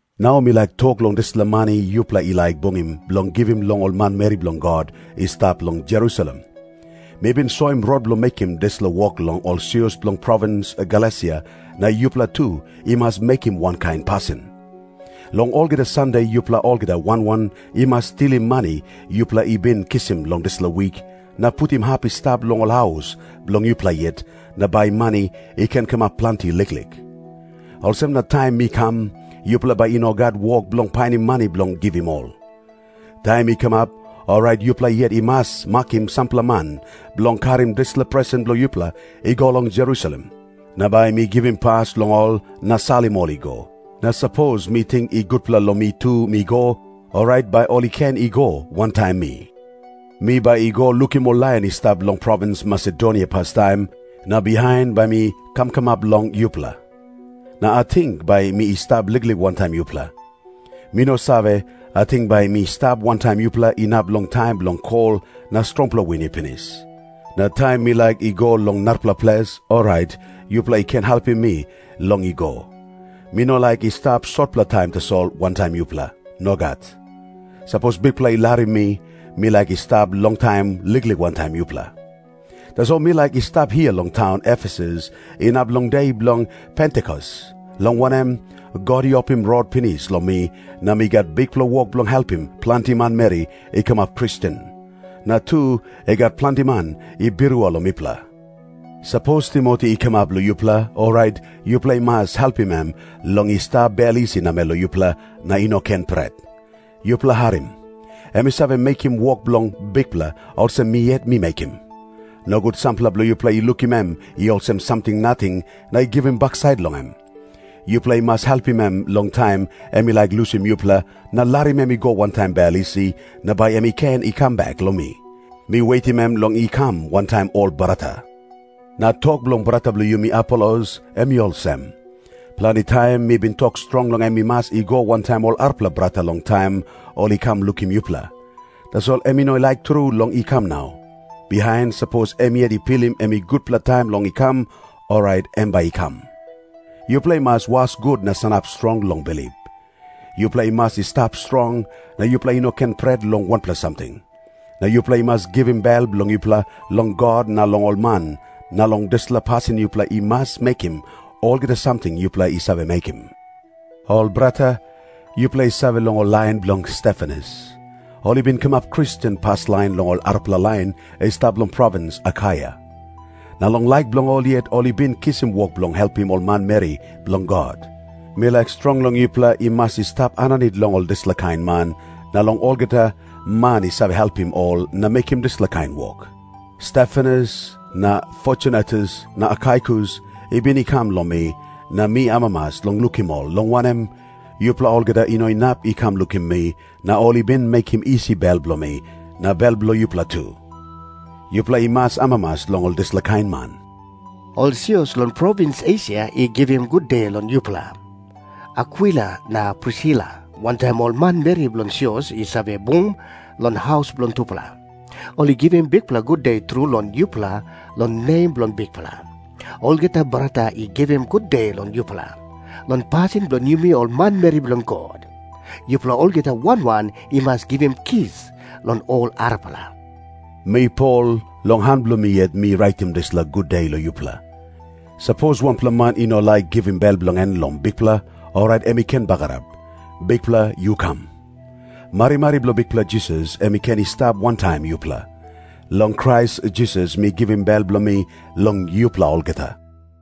Nau mi laik tok long dispela mani yupela i laik bungim bilong givim long ol manmeri bilong God i stap long Jerusalem. Mi bin soim rot bilong mekim dispela wok long ol sios bilong provins Galesia, na yupela tu i mas mekim wankain pasin. Long olgeta Sande yupela olgeta wan wan i mas tilim mani yupela i bin kisim long dispela wik, na putim hap i stap long ol haus bilong yupela yet, na bai mani i ken kamap planti liklik. Olsem na taim mi kam, yupela bai i no gat wok bilong painim mani bilong givim ol. Taim mi kamap, orait yupela yet i mas makim sampela man bilong karim dispela presen bilong yupela i go long Jerusalem. Na bai mi givim pas long ol na salim ol i go. Na sapos mi ting i gutpela long mi tu mi go, orait bai ol i ken i go wantaim mi. Mi bai i go lukim ol lain i stap long provins Masedonia pastaim, na bihain bai mi kam kamap long yupela. Na ating bai mi stap liklik wantaim yupela. Mi no save, ating bai mi stap wantaim yupela inap long taim bilong kol na strongpela win i pinis. Na taim mi laik i go long narapela ples, orait yupela i ken helpim mi long i go. Mi no laik i stap sotpela taim tasol wantaim yupela. Nogat. Sapos Bikpela i larim mi, mi laik i stap longtaim liklik wantaim yupela. Tasol mi laik i stap hia long taun Efesus inap long de bilong Pentikos, long wanem, God i opim rot pinis long mi, na mi gat bikpela wok bilong helpim planti manmeri i kamap Kristen. Na tu, i gat planti man i birua long mipela. Sapos Timoti i kamap long yupela, orait yupela i mas helpim em long i stap bel isi namel long yupela, na i no ken pret. Yupela harim. Em i save mekim wok bilong Bikpela, olsem mi yet mi mekim. Nogut sampela bilong yupela i lukim em i olsem samting nating na i givim baksait long em. Yupela i mas helpim em long taim em i laik lusim yupela na larim em i go wantaim bel isi, na bai em i ken i kam bek long mi. Mi wetim em long i kam wantaim ol brata. Na tok bilong brata bilong yumi Apolos, em i olsem. Planti taim mi bin tok strong long em i mas i go wantaim ol arapela brata long taim ol i kam lukim yupela. Tasol em i no laik tru long i kam nau. Bihain, sapos em yet i pilim em i gutpela taim long i kam, orait em bai i kam. Yupela i mas was gut na sanap strong long bilip. Yupela i mas i stap strong, na yupela i no ken pret long wanpela samting. Na yupela i mas givim bel bilong yupela long God na long ol man, na long dispela pasin yupela i mas mekim olgeta samting yupela i save mekim. Ol brata, yupela i save long ol lain bilong Stefanas. Ol i bin kamap Kristen paslain long ol arapela lain i stap long provins Akaia. Na long laik bilong ol yet ol i bin kisim wok bilong helpim ol manmeri bilong God. Mi laik strong long yupela i mas i stap aninit long ol dispela kain man, na long olgeta man i save helpim ol na mekim dispela kain wok. Stefanas na Fortunatus na Akaikus i bin i kam long mi, na mi amamas long lukim ol, long wanem, yupela olgeta i no inap i kam lukim mi na ol i bin mekim isi bel bilong mi, na bel bilong yupela tu. Yupela i mas amamas long ol dispela kain man. Ol sios long provins Esia i givim gude long yupela. Akwila na Prisila wantaim ol manmeri bilong sios i save bung long haus bilong tupela, ol i givim bikpela gude tru long yupela long nem bilong Bikpela. Olgeta brata i givim gude long yupela. Long pasin bilong yumi ol manmeri bilong God, yupela olgeta wan wan i mas givim kis long ol arapela. Mi Pol, long han bilong mi yet mi raitim dispela gude long yupela. Sapos wanpela man i no laik givim bel bilong em long Bikpela, orait em i ken bagarap. Bikpela, yu kam. Marimari bilong Bikpela Jisas em i ken i stap wantaim yupela. Long Krais Jisas mi givim bel bilong mi long yupela olgeta.